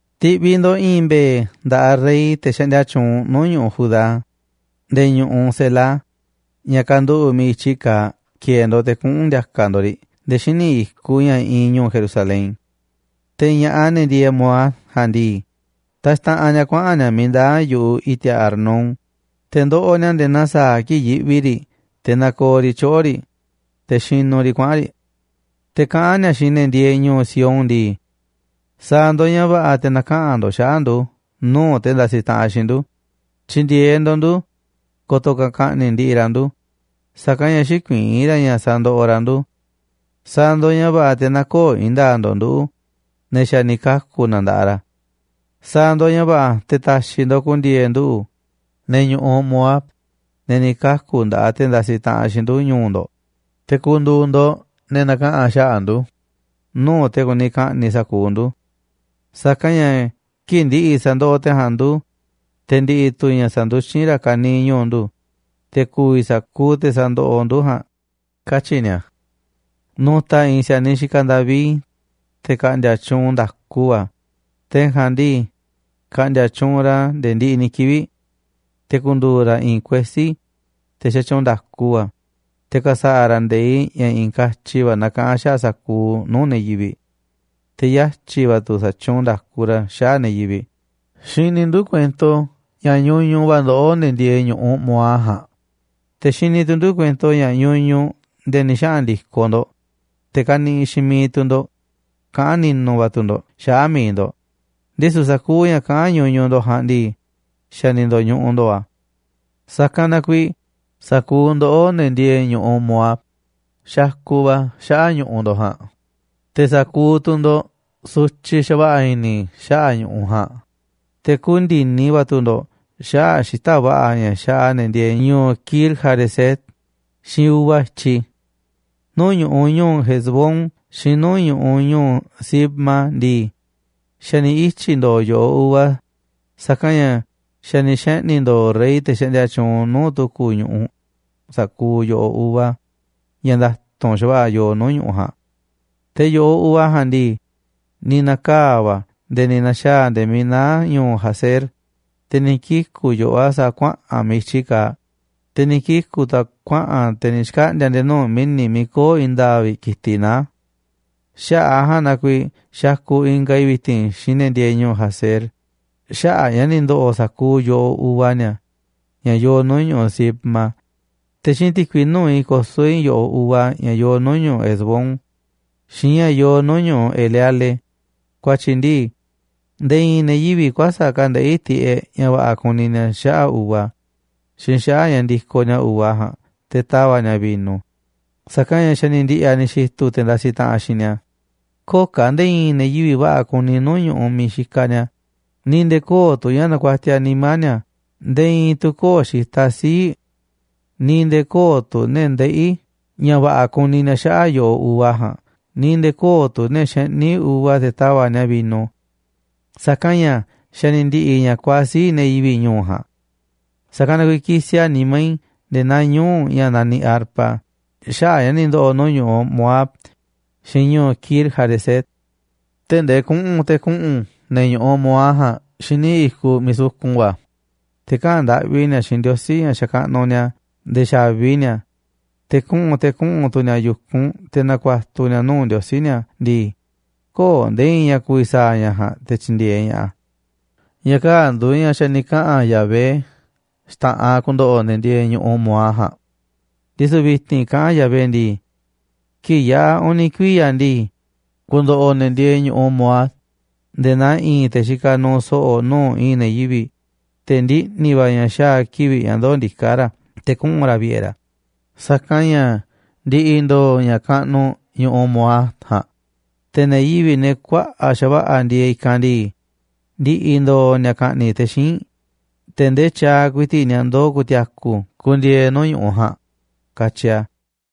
Ti̱ꞌviꞌ ndo̱ꞌ i̱i̱n mbe̱e̱ nda̱ꞌaꞌ rey, te̱ xaꞌndia tyuunꞌ nuu̱ꞌ ñu̱ꞌuꞌ Judá nde̱e̱ ñu̱ꞌuꞌ Sela, ña̱ kanduꞌu̱ꞌ miiꞌ i̱tyi kaaꞌ, ki̱e̱e̱ ndo̱ꞌ te̱ kuꞌu̱n ndi̱a̱ka̱ ndo̱ꞌ riꞌ nde̱e̱ xíniꞌ i̱kuꞌ ña̱ iinꞌ ñu̱u̱ Jerusalén. Te̱ ña̱ꞌaꞌ, ne̱ ndieeꞌ Moab ja̱a̱nꞌ ndii, taxtaꞌanꞌ ni̱a̱ kuaꞌa̱n ni̱a̱ miiꞌ ndaa̱ yu̱ꞌuꞌ i̱ti̱a̱ Arnón, te̱ ndoꞌoꞌ ni̱a̱ nde̱e̱ naa sa̱a̱ kii̱ꞌ yiꞌvi riꞌ te̱ nakooꞌ riꞌ tyoꞌo̱ riꞌ, te̱ xinuꞌ riꞌ kuaꞌa̱n riꞌ. Te̱ kaꞌán ni̱a̱ xiinꞌ ne̱ ndieeꞌ ñu̱u̱ Sión ndii: “Sa̱a̱ ndo̱ꞌ ña̱ va̱ꞌa̱ te̱ na̱kaꞌa̱n ndo̱ꞌ xaꞌa̱ꞌ ndu̱ nuu̱ꞌ te̱ ndasiꞌ taꞌanꞌ xiinꞌ ndu̱. Tyi̱ndi̱e̱eꞌ ndo̱ꞌ ndu̱ ko̱to̱ ka̱ ka̱ꞌni̱ꞌ ndiꞌiꞌ ra̱ ndu̱, sa̱kanꞌ ña̱ xïkuiín ra̱ ña̱ sandoꞌoꞌ ra̱ ndu̱. Sa̱a̱ ndo̱ꞌ ña̱ va̱ꞌa̱ te̱ nä̱ko̱o̱ i̱i̱n nda̱a̱ꞌ ndo̱ꞌ nduꞌu̱, ne̱ xa̱ ni̱ kaku̱ na nda̱ꞌaꞌ ra̱. Sa̱a̱ ndo̱ꞌ ña̱ va̱ꞌa̱ te̱ ta̱xi̱ ndo̱ꞌ ku̱ndi̱e̱e̱ nduꞌu̱, ne̱ ñu̱ꞌuꞌ Moab, ne̱ ni̱ kaku̱ nda̱ꞌaꞌ te̱ ndasiꞌ taꞌanꞌ xiinꞌ ndu̱, ñu̱u̱ ndo̱ꞌ, te̱ ku̱ndu̱u̱ ndo̱ꞌ ne̱ na̱kaꞌa̱n xaꞌa̱ꞌ ndu̱ꞌ nuu̱ꞌ te̱ kuni ka̱ꞌni̱ꞌ sa̱kuuꞌ ndu̱. Sa̱kanꞌ ña̱ kii̱ꞌ ndi̱ꞌi̱ sa̱ndoꞌoꞌ te̱ ja̱a̱nꞌ ndu̱, te̱ ndi̱ꞌi̱ tu̱ ña̱ sa̱nduxín ra̱ ka̱niiꞌ ñu̱u̱ ndu̱, te̱ ku̱vi̱ sa̱kuuꞌ te̱ sandoꞌoꞌ ndu̱ ja̱a̱nꞌ”, katyi̱ ni̱a̱. Nu̱ta̱ i̱i̱n si̱a̱niꞌ xikaꞌ David, te̱ ka̱ꞌndi̱a̱ tyuunꞌ nda̱ku va̱, te̱ ja̱a̱nꞌ ndii, ka̱ꞌndi̱a̱ tyuunꞌ ra̱ nde̱e̱ ndiꞌiꞌ ni̱ kivi̱ꞌ. Te̱ ku̱ndu̱u̱ ra̱ i̱i̱n kuesí, te̱ xatyuunꞌ nda̱ku va̱, te̱ ka̱sa̱ꞌa̱ ra̱ nde̱iꞌ ña̱ i̱i̱n katyi va̱ nakaꞌán xaꞌa̱ꞌ sa̱kuuꞌ nuu̱ꞌ ne̱ yivi̱ꞌ. Te̱ yatyi̱ va̱ tu̱ sa̱tyuunꞌ nda̱ku ra̱ xaꞌa̱ꞌ ne̱ yivi̱ꞌ. Xiniꞌ ndu̱ kuento ña̱ ñuñuꞌ va̱ ndoꞌó, ne̱ ndieeꞌ ñu̱ꞌuꞌ Moab ja̱a̱nꞌ, te̱ xini tu̱ ndu̱ kuento ña̱ ñuñuꞌ nde̱e̱ ni̱ xaꞌa̱n ndi̱koꞌ ndo̱ꞌ, te̱ kaniꞌiꞌ xiinꞌ miiꞌ tu̱ ndo̱ꞌ, kaꞌán ni̱nu̱ va̱ tu̱ ndo̱ꞌ xaꞌa̱ꞌ mi̱iꞌ ndo̱ꞌ, ndisu̱ sa̱kuuꞌ ña̱ kaꞌán ñuñuꞌ ndo̱ꞌ ja̱a̱nꞌ ndii, xa̱ ni̱ ndo̱ñuꞌuꞌ ndo̱o̱ a̱. Sa̱kanꞌ na kuiiꞌ sa̱kuuꞌ ndoꞌó, ne̱ ndieeꞌ ñu̱ꞌuꞌ Moab, xakuꞌ va̱ xaꞌa̱ꞌ ñu̱ꞌuꞌ ndo̱ꞌ ja̱a̱nꞌ, te̱ sa̱kuuꞌ tu̱ ndo̱ꞌ sutyiꞌ xa̱va̱ꞌa̱ i̱ni̱ xaꞌa̱ꞌ ñu̱ꞌuꞌ ja̱a̱nꞌ, te̱ kuuꞌ ndi̱ni va̱ tu̱ ndo̱ꞌ xaꞌa̱ꞌ xita̱ꞌ va̱ꞌa̱ ña̱ xaꞌa ne̱ ndieeꞌ ñu̱u̱ Kir-hareset xiinꞌ uva i̱tyiꞌ. Nuu̱ꞌ ñu̱ꞌuꞌ ñu̱u̱ Hesbón xiinꞌ nuu̱ꞌ ñu̱ꞌuꞌ ñu̱u̱ Sibma ndii, xa̱ ni̱ ityi̱ ndo̱o̱ yo̱ꞌoꞌ uva, sa̱kanꞌ ña̱ xa̱ ni̱ xeꞌni̱ ndo̱o̱ rey, te̱ xaꞌndia tyuunꞌ nuu̱ꞌ tu̱ku̱ ñu̱ꞌuꞌ, sa̱kuuꞌ yo̱ꞌoꞌ uva ña̱ nda̱tu̱nꞌ xa̱va̱ꞌa̱ yoo nuu̱ꞌ ñu̱ꞌuꞌ ja̱a̱nꞌ. Te̱ yo̱ꞌoꞌ uva ja̱a̱nꞌ ndii, ni̱ na̱kaa̱ va̱ a̱ nde̱e̱ ni̱ na̱xa̱a̱ a̱ nde̱e̱ miiꞌ naá ñu̱u̱ Jazer, te̱ ni̱ kiku̱ yo̱ꞌoꞌ a̱ sa̱a̱ kuaꞌa̱n miiꞌ i̱tyi kaaꞌ, te̱ ni̱ kiku̱ tu̱ a̱ kuaꞌa̱n a̱ te̱ ni̱ xkaꞌndi̱a̱ a̱ nde̱e̱ nuu̱ꞌ mi̱ni̱ miiꞌ köo̱ꞌ i̱i̱n nda̱a̱ꞌ vi̱ꞌ ki̱tiꞌ naá. Xaꞌa̱ꞌ a̱ ja̱a̱nꞌ na kuiiꞌ xakuꞌ ingaꞌ i̱ vi̱ti̱n xiinꞌ ne̱ ndieeꞌ ñu̱u̱ Jazer xaꞌa̱ꞌ a̱ ña̱ ni̱ ndo̱ꞌo̱ sa̱kuuꞌ yo̱ꞌoꞌ uva ni̱a̱ ña̱ yoo nuu̱ꞌ ñu̱ꞌuꞌ Sibma, te̱ xiinꞌ ti̱kui nuu̱ꞌ i̱ koso̱ i̱ yo̱ꞌoꞌ uva ña̱ yoo nuu̱ꞌ ñu̱ꞌuꞌ Hesbón, xiinꞌ ña̱ yoo nuu̱ꞌ ñu̱ꞌuꞌ Eleale, ku̱a̱tyi̱ ndii, nde̱e̱ i̱i̱n ne̱ yivi̱ꞌ kuäsa̱ꞌ ka̱ ndeꞌí tiꞌeꞌ ña̱ va̱ꞌa̱ kuni ni̱a̱ xaꞌa̱ꞌ uva xiinꞌ xaꞌa̱ꞌ ña̱ ndikoꞌ ni̱a̱ uva ja̱a̱nꞌ te̱ ta̱va̱ꞌ ni̱a̱ vino, sa̱kanꞌ ña̱ xa̱ ni̱ ndi̱ꞌi̱ a̱ ni̱ xi̱tu̱ te̱ ndasiꞌ taꞌanꞌ xiinꞌ ni̱a̱. Köo̱ꞌ ka̱ nde̱e̱ i̱i̱n ne̱ yivi̱ꞌ va̱ꞌa̱ kuni nuu̱ꞌ ñu̱ꞌuꞌ miiꞌ xikaꞌ ni̱a̱, ni̱ nde̱e̱ köo̱ꞌ tu̱ ña̱ nakuatiaꞌ nimá ni̱a̱. Nde̱e̱ i̱i̱n tu̱ köo̱ꞌ xitaꞌ sii̱ꞌ, ni̱ nde̱e̱ köo̱ꞌ tu̱ ne̱ ndeꞌí ña̱ va̱ꞌa̱ kuni ni̱a̱ xaꞌa̱ꞌ yo̱ꞌoꞌ uva ja̱a̱nꞌ, ni̱ nde̱e̱ köo̱ꞌ tu̱ ne̱ xeꞌní uva te̱ tava̱ꞌ ni̱a̱ vino. Sa̱kanꞌ ña̱ xa̱ ni̱ ndi̱ꞌi̱ ña̱ kuaaꞌ sii̱ꞌ ne̱ yivi̱ꞌ ñu̱u̱ ja̱a̱nꞌ. Sa̱kanꞌ na kuiiꞌ kisiꞌ a̱ nimá i̱ nde̱e̱ naa ñuu̱ꞌ ña̱ naniꞌ arpa xaꞌa̱ꞌ ña̱ ni̱ ndo̱ꞌo̱ nuu̱ꞌ ñu̱ꞌuꞌ Moab xiinꞌ ñu̱u̱ Kir-hareset. Tee̱ꞌ ndee kuꞌu̱n te̱ kuꞌu̱n ne̱ ñu̱ꞌuꞌ Moab ja̱a̱nꞌ xíniꞌ i̱kuꞌ miiꞌ sukun va̱, te̱ kaꞌa̱n ndaꞌvi ni̱a̱ xiinꞌ ndiosí, ña̱ xakaꞌnuꞌ ni̱a̱, nde̱e̱ xa̱vi ni̱a̱. Te̱ kuꞌu̱n te̱ kuꞌu̱n tu̱ ni̱a̱ yu̱kunꞌ te̱ na̱ku̱a̱tu̱ ni̱a̱ nuu̱ꞌ ndiosí ni̱a̱ ndii, köo̱ꞌ nde̱e̱ i̱i̱n ña̱ ku̱vi̱ sa̱a̱ ña̱ ja̱a̱nꞌ te̱ tyi̱ndi̱e̱eꞌ ña̱ꞌaꞌ a̱. Ña̱ kaa̱ꞌ nduuꞌ ña̱ xa̱ ni̱ kaꞌa̱n Yahvé xta̱ꞌanꞌ ku̱ndo̱ꞌo̱ ne̱ ndieeꞌ ñu̱ꞌuꞌ Moab ja̱a̱nꞌ. Ndisu̱ vi̱ti̱n kaꞌán a̱ Yahvé ndii: “Kii̱ꞌ yaꞌa̱ uni̱ kuiya̱ ndii, ku̱ndo̱ꞌo̱ ne̱ ndieeꞌ ñu̱ꞌuꞌ Moab nde̱e̱ naa i̱i̱n te̱ xikaꞌ nuuꞌ so̱ꞌo̱ nuu̱ꞌ i̱i̱n ne̱ yivi̱ꞌ, te̱ ndiꞌni̱ va̱ ña̱ xaa̱ kiꞌi̱ꞌ ña̱ ndoo̱ ndiká ra̱ te̱ kuꞌu̱n ra̱ vi̱ꞌe̱ ra̱, sa̱kanꞌ ña̱ ndi̱ꞌi̱ ndo̱o̱ ña̱ kaꞌnuꞌ ñu̱ꞌuꞌ Moab ja̱a̱nꞌ, te̱ ne̱ yivi̱ꞌ, ne̱ kuaꞌa̱ꞌ xa̱va̱ꞌa̱ ndieeꞌ i̱kanꞌ ndii, ndi̱ꞌi̱ ndo̱o̱ ni̱a̱ ka̱ꞌni̱ꞌ te̱ xíinꞌ, te̱ ndee tyaaꞌ ku̱i̱ti̱ꞌ ni̱a̱ ndoo̱ ku̱ti̱a̱ku̱ ku̱ndi̱e̱e̱ nuu̱ꞌ ñu̱ꞌuꞌ ja̱a̱nꞌ”, katyi a̱.